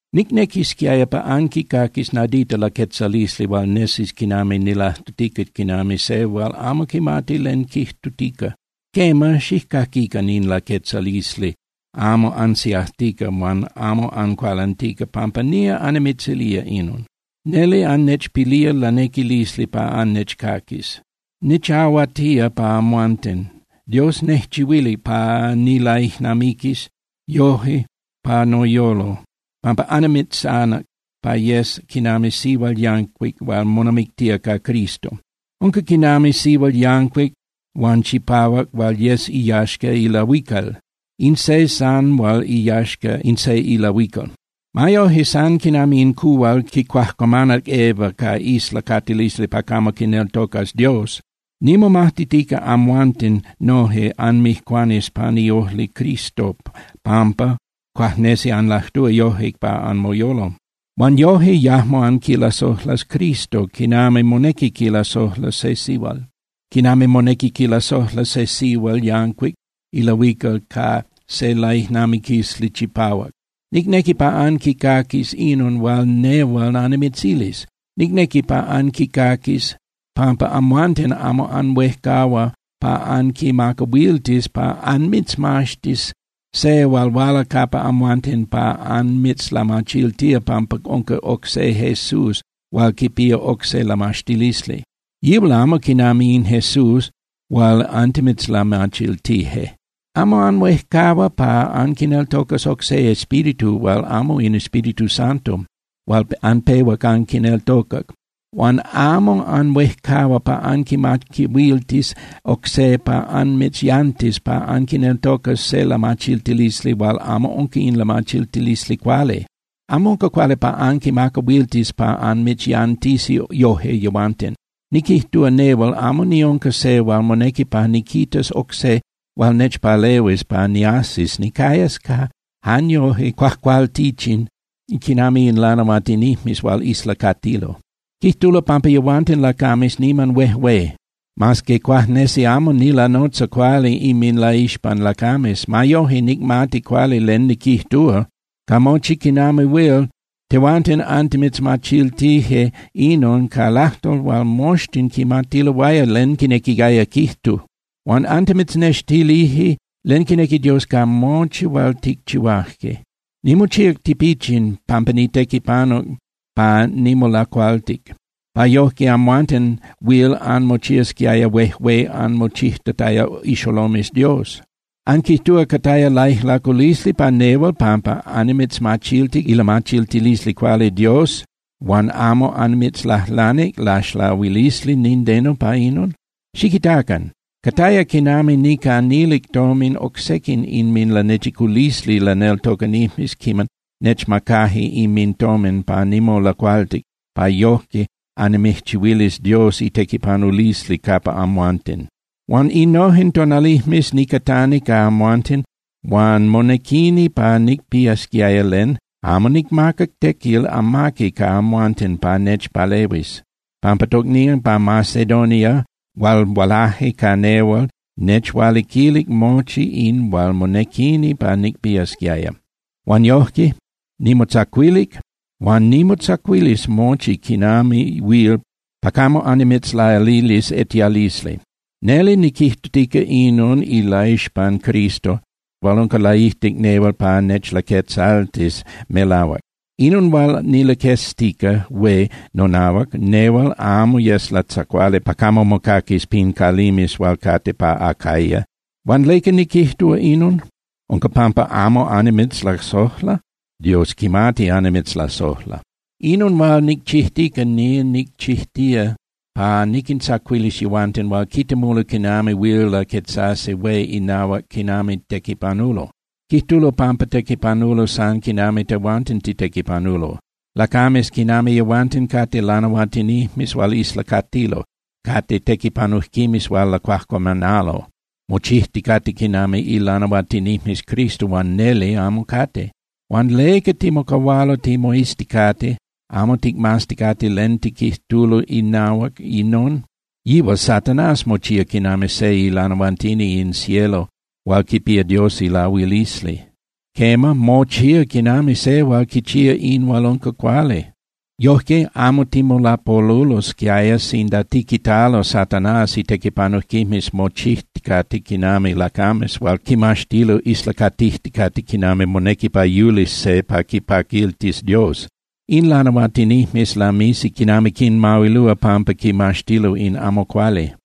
Nicnequisquiaya pa anquicaquis nadita laquetzalisli hual nesis quinami nilajtutica quinami se hual amo quimati len quijtutica. Quema, xijcaquican in laquetzalisli amo ansiajtica huan amo ancualantica pampa nía annimitzilía inon. Neli annechpilía lanequilisli pa annechcaquis. Nichahuatía pa amhuanten, Dios nejchihuilic pa nilaijnamiquis yoje pa noyolo, pampa annimitzanac pa anyes quinami sihual yancuic hual monamictía ca Cristo. Unca quinami sihual yancuic huan chipahuac hual yes iyaxca ilahuical, in se san hual iyaxca in se ilahuical. Ma yoje, san quinami in cuhual quicuajcuamanac Eva ca islacatilisli pa camo quineltocas Dios, nimomajtitica amhuanten noje anmijcuanis pan iojli Cristo pampa cuajnesi anlajtúa yoje pa anmoyolo. Huan yoje yajmo anquilasojlas Cristo quinami monequi quilasojla se sihual yancuic ilahuical ca se laijnamiquilisli chipahuac. Nicnequi pa anquicaquis inon hual nehual annimitzilis. Nicnequi pa anquicaquis pampa amhuanten amo anhuejcahua pa anquimacahuiltis pa anmitzmaxtis se hual huala capa amhuanten pa anmitzlamachiltía pampa unca oc se Jesús hual quipía oc se lamaxtilisli. Yihual amo quinami in Jesús hual antimitzlamachiltije. Amo anhuejcahua pa anquineltocas oc se espíritu hual amo in Espíritu Santo hual anpehuac anquineltocac. Huan amo anhuejcahua pa anquimacahuiltis oc se pa anmitzyantis pa anquineltocas se lamachiltilisli hual amo unca in lamachiltilisli cuali. Amo unca cuali pa anquimacahuiltis pa anmitzyantisi yoje yehuanten. Niquijtúa nehual amo niunca se hual monequi pa niquitas oc se hual nechpalehuis pa niajsis nicayas jan yoje cuajcualtichin quinami in lanahuatinijmes hual islacatilo. Quijtulo pampa yehuanten lacames niman huejué. Mas que cuajnesi amo nilanotza cuali inminlaixpan lacames, ma yoje nicmati cuali len niquijtúa. Ca mochi quinami huil, tehuanten antimitzmachiltije inon ca lajtol hual moxtin quimatiloaya len quinequiaya quijtu. Huan antimitznextilije len quinequi Dios ca mochi hual ticchihuaje. Nimochíac tipichin pampa nitequipanuc pa nimolacualtic, pa yojque amhuanten huil anmochiasquiaya huejué anmochijtataya ixolomes Dios. ¿Anquijtúa cataya laijlaculisli pa nehual pampa annimitzmachiltic ilamachiltilisli cuali Dios huan amo annimitzlajlanic laxlahuilisli nindeno pa inon? Xiquitacan, cataya quinami nicanilic tomin oc sequin inminlanechiculisli laneltocanijmes quiman nechmacaje inmintomin pa nimolacualtic pa yojque annimijchihuilis Dios itequipanulisli capa amhuanten. Huan innojen tonalijmes nicatani ca amhuanten huan monequini pa nicpiasquiaya len, amo nicmacac tequil amaqui ca amhuanten pa nechpalehuis, pampa tocnían pa Macedonia hual hualaje ca nehual nechhualiquilic mochi in hual monequini pa nicpiasquiaya. Huan yojque nimotzacuilic huan nimotzacuilis mochi quinami huil pa camo annimitzlalilis etialisli. Neli niquijtutica inon ilaixpan Cristo hual unca laijtic nehual pa nechlaquetzaltis melahuac. Inon hual nilaqueztica hué nonahuac nehual amo yes latzacuali pa camo mocaquis pin calimes hual cate pa Acaya. Huan ¿leca niquijtúa inon? ¿Unca pampa amo annimitzlasojla? ¡Dios quimati annimitzlasojla! Inon hual nicchijtica, nía nicchijtía pa niquintzacuilis yehuanten hual quitemulo quinami huil laquetzasi hué inahuac quinami tequipanulo. Quijtulo pampa tequipanulo san quinami tehuanten titequipanulo. Lacames quinami yehuanten cate lanahuatinijmes hual islacatilo, cate tequipanujquimes hual lacuajcuamanalo, mochijticate quinami ilanahuatinijmes Cristo, huan neli amo cate. Huan ¿leca timocahualo timoizticate, amo ticmazticate len tiquijtulo inahuac inon? Yihual Satanás mochía quinami se ilanahuatini in cielo hual quipía Dios ilahuilisli. Quema, mochía quinami se hual quichía in hual unca cuali. Yojque, amo timolapolulosquiaya sinda tiquitalo Satanás itequipanujquimes mochijticate quinami lacames hual quimaxtilo islacatijticate quinami monequi pa yulis se pa quipaquiltis Dios. In lanahuatinijmes lamisi quinami quinmahuilúa pampa quimaxtilo in amo cuali.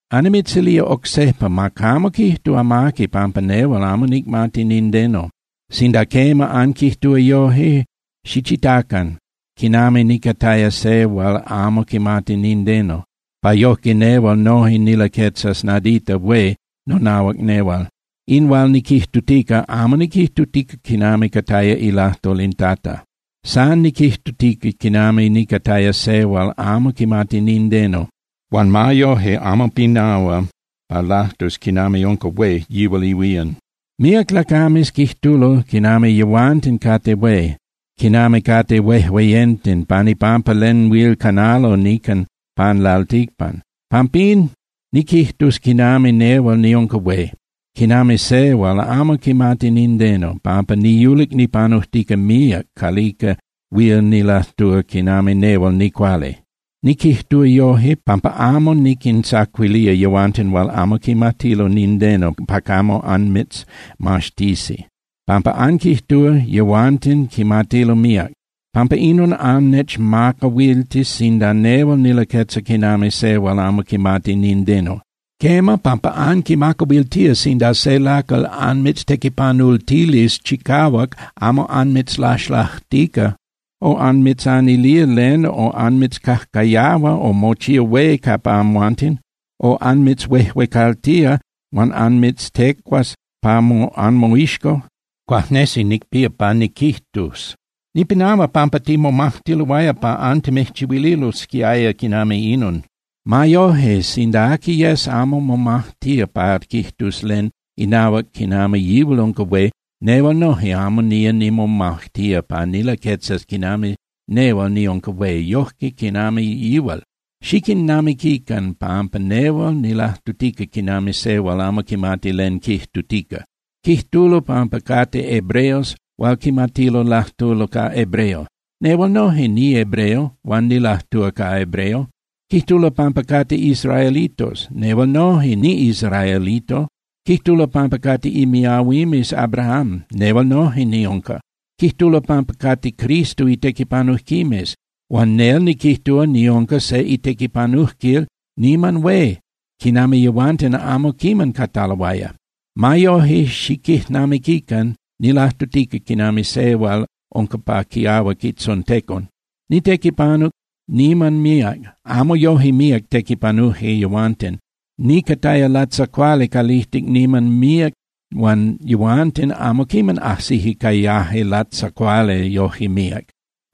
Annimitzilía oc sejpa, ma camo quijtu amaqui pampa nehual amo nicmati nindeno. Sinda quema anquijtúa yoje, xichitacan quinami nicataya se hual amo quimati nindeno, pa yojque nehual noje nilaquetzas nadita hué nonahuac nehual. In hual niquijtutica, amo niquijtutica quinami cataya ilajtol in Tata. San niquijtutica quinami nicataya se hual amo quimati nindeno huan ma yoje amo pinahua pa lajtus quinami unca hué yihual ihuían. Míac lacames quijtulo quinami yehuanten cate hué, quinami cate huejueyenten pan ipampa len huil canalo nican pan lalticpan. Pampín niquijtus quinami nehual niunca hué, quinami se hual amo quimati nindeno, pampa niyulic nipanujtica míac calica huil nilajtúa quinami nehual nicuali. Niquijtúa yoje, pampa amo anquintzacuilía yehuanten hual amo quimatilo nindeno pa camo anmitzmaxtisi, pampa anquijtúa yehuanten quimatilo míac. Pampa inon annechmacahuiltis sinda nehual nilaquetza quinami se hual amo quimati nindeno. Quema, pampa anquimacahuiltía sinda se lacal anmitztequipanultilis chicahuac amo anmitzlaxlajtica, o anmitzanilía len o anmitzcajcayahua o mochía hué capa amhuanten o anmitzhuejuecaltía huan anmitztecua pa anmoixco. Cuajnesi nicpía pa niquijtus: “¡Nipinahua pampa timomajtiloaya pa antimijchihuililosquiaya quinami inon!” Ma yoje, sinda aqui yes amo momajtía pa quijtus len inahuac quinami yihual unca hué, nehual noje amo nía nimomajtía pa nilaquetzas quinami nehual niunca hué yoje quinami yihual. Xiquijnamiquican pampa nehual nilajtutica quinami se hual amo quimati len quijtutica. Quijtulo pampa cate hebreos hual quimatilo lajtulo ca hebreo. Nehual noje nihebreo huan nilajtúa ca hebreo. Quijtulo pampa cate israelitos. Nehual noje, niꞌisraelito. Quijtulo pampa cate imiahuimes Abrahám. Nehual noje niunca. Quijtulo pampa cate Cristo itequipanujquimes. Huan nel niquijtúa niunca se itequipanujquil niman hué quinami yehuanten amo quiman cataloaya. Ma yoje xiquijnamiquican, nilajtutica quinami se hual unca pa quiahuac itzontecon. Nitequipanuc niman míac, amo yoje míac tequipanuje yehuanten. Nicataya latzacuali calijtic niman míac huan yehuanten amo quiman ajsije cayaje latzacuali yoje míac.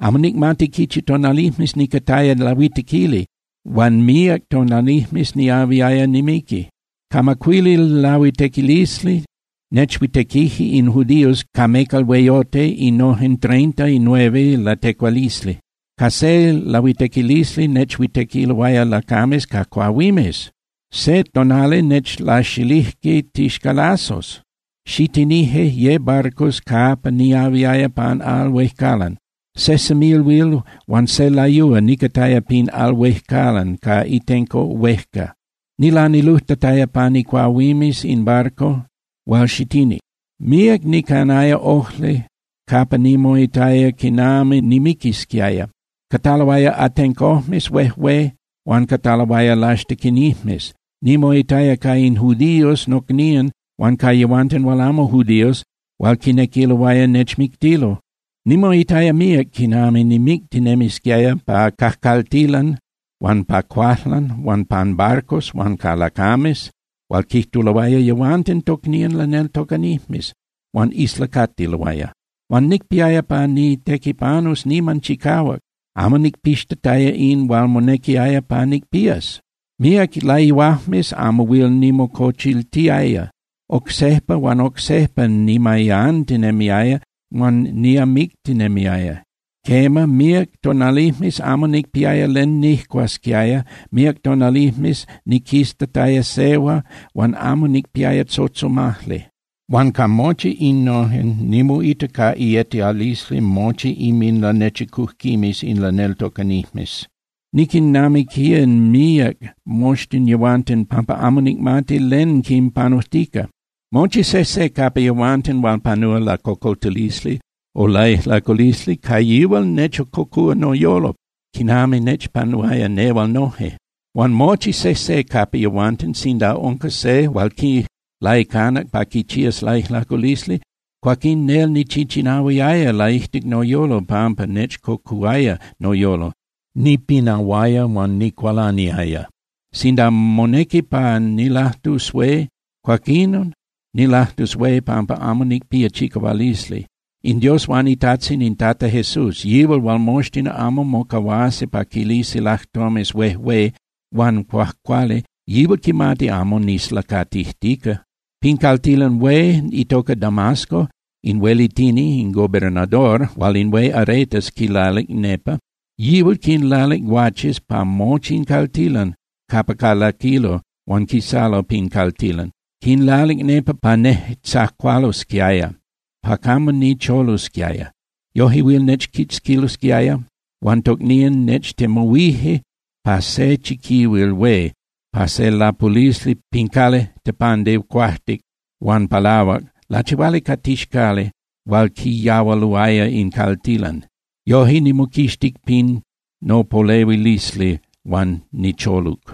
Amo nicmati quichi tonalijmes nicataya lahuitequili huan míac tonalijmes niahuiaya nimiqui. Ca macuili lahuitequilisli nechhuitequije in judíos ca mecal hueyote innojen treinta y nueve latecualisli. Ca ye lahuitequilisli nechhuitequiloaya lacames ca cuahuimes. Se tonali nechlaxilijque tixcalazos. Xitinije ye barcos capa niahuiaya pan al huejcalan. Se semilhuil huan se layúa nicataya pin al huejcalan ca itenco huejca. Nilanilujtataya pan icuahuimes in barco hual xitinic. Míac nicanaya ojli capa nimoitaya quinami nimiquisquiaya. Cataloaya atencojmes huejué huan cataloaya laxtequinijmes. Nimoitaya ca in judíos nocnían huan ca yehuanten hual amo judíos hual quinequiloaya nechmictilo. Nimoitaya míac quinami nimictinemisquiaya pa cajcaltilan huan pa cuajlan huan pan barcos huan ca lacames hual quijtuloaya yehuanten tocnían laneltocanijmes huan islacatiloaya. Huan nicpiaya pa nitequipanus niman chicahuac, amo nicpixtataya in hual monequiaya pa nicpías. Míac layuajmes amo huil nimocochiltiaya, oc sejpa huan oc sejpa nimayantinemiaya huan niamictinemiaya. Quema, míac tonalijmes amo nicpiaya len nijcuasquiaya, míac tonalijmes niquiztataya sehua huan amo nicpiaya tzotzomajli. Huan ca mochi innojen, nimoita ca ietialisli mochi inminlanechicujquimes in laneltocanijmes. Niquijnamiquía míac moxtin yehuanten pampa amo nicmati len quinpanujtica. Mochi sejse capa yehuanten hual panúa lacocoltilisli o laijlaculisli, ca yihual nechcocúa noyolo quinami nechpanuaya nehual yoje. Huan mochi sejse capa yehuanten sinda unca se hual quilaicanac pa quichías laijlaculisli, cuaquín nel nichichinahuiaya laijtic noyolo pampa nechcocuhuaya noyolo, nipinahuaya huan nicualaniaya. Sinda monequi pa nilajtus hué, cuaquinon nilajtus hué pampa amo nicpía chicahualisli. In Dios huan iTajtzin in Tata Jesús, yihual hual moxtin amo mocahuasi pa quilisi lajtomes huejué huan cuajcuali, yihual quimati amo nislacatijtica. Pin caltilan hué itoca Damasco, in huelitini (gobernador) hual in hué Aretas quilalic nepa, yihual quinlalic guaches pa mochi in caltilan capa calaquilo huan quisalo pin caltilan. Quinlalic nepa pa nejtzacualosquiaya pa camo nicholusquiaya. Yoje huil nechquitzquilosquiaya. Huan tocnían nechtemuhuije pa se chiquihuil hué pa se lapulisli pin cali (tepandi) cuajtic huan palahuac lachihuali ca tixcali hual quiyahualuaya in caltilan. Yoje nimoquixtic pin nopolehuilisli huan nicholuc.